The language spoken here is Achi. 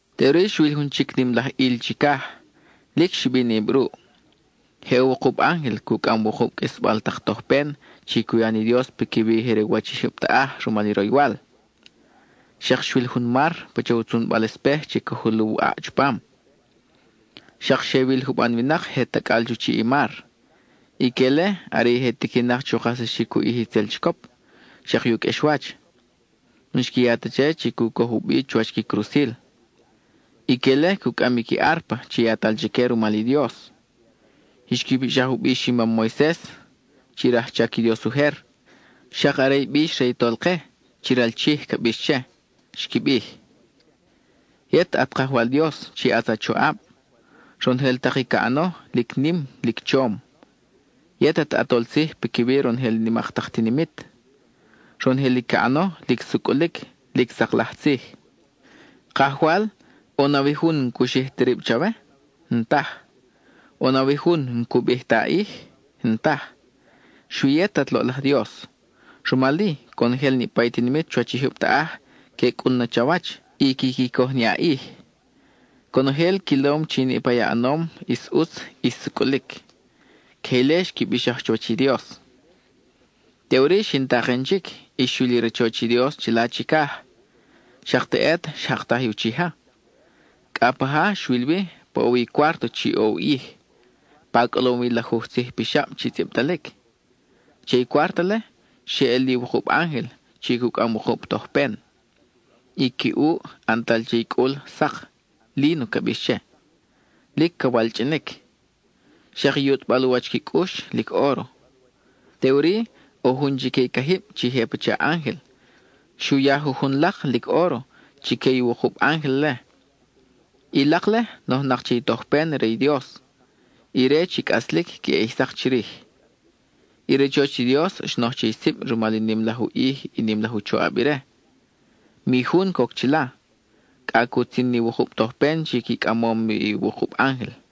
Teʼuri xwil jun chic nim laj ʼil chicaj, lic xibinʼib ruʼ. Je ʼo wukub ángel cucʼam wukub qʼuisbal tak tojpen chi cu ya ni Dios piquiwi i je re u wach i jyub taʼaj rumal i roywal. Xak xwil jun mar, pacha u tzunbal espej chi ca juluw ʼaʼ chupam. Xak xe wil juban winak je tacʼal chu chiʼ i mar. Ique-le are i je tiquinak chu kajsaxic u ʼij itzel chicop, xak i u qʼuexwach. N-xqui ya ta che chi cu coj u bi chuwach qui crusil. Ique-le cucʼam i qui árpa chi yatal chique rumal i Dios. Xqui bixaj u bix i mam Moises, chi rajchac i Dios ujer; xak are i bix re i Tolke chi ral Chij ca bix che. Xqui bij: Yet at Kajwal Dios chi ʼatz a choʼab, ¡Ronojel tak i ca ʼano, lic nim lic chom! Yet at ʼAtol Tzij piquiwi ronojel i nimak tak tinimit, ¡Ronojel i ca ʼano, lic sucʼulic, lic sak laj tzij! Kajwal, ¿ʼo nawi jun n-cu xij ta rib chawe? N-taj. ¿ʼO nawi jun n-cu bij ti a ʼij? N-taj. Xui yet at loʼlaj Dios, rumal-i, conojel niʼpa i tinimit chuwach i jyub taʼaj que cʼun na chawach y quiqui coj ni a ʼij, conojel quilom chi niʼpa i a ʼanom ʼis ʼutz, ʼis sucʼulic. (Queje ile xqui bixaj chuwach i Dios.) Teʼuri, xin taken chic y xwil i rachoch i Dios chila chicaj; xak teʼet, xjaktaj i uchija. Cʼa paja xwil wi, pa ʼo wi i cuárto chi ʼo u ʼij, pa cʼolom wi i lajuj tzij pixab chi tzʼibtalic. Che i cuárto-le, xe ʼel li wukub ángel chi cucʼam wukub tojpen. I qui ʼuʼ, ʼantal che i cʼul sak, líno ca bix che; lic ca walchʼinic. Xak i yutʼbal u wach qui cʼux, lic óro. Teʼuri, ʼo jun chique i cajib chi je pacha ángel, xu ya jujun lak, lic óro, chique i wukub ángel-le. I lak-le, nojnak che i tojpen re i Dios, ire chi cʼaslic queʼe ʼij sak chirij. I rachoch i Dios xnoj che i sib rumal i nim laj u ʼij i nim laj u choʼab ire. Mi jun coc chila, cʼa cutzin ni wukub tojpen chi qui cʼamom bi i wukub ángel.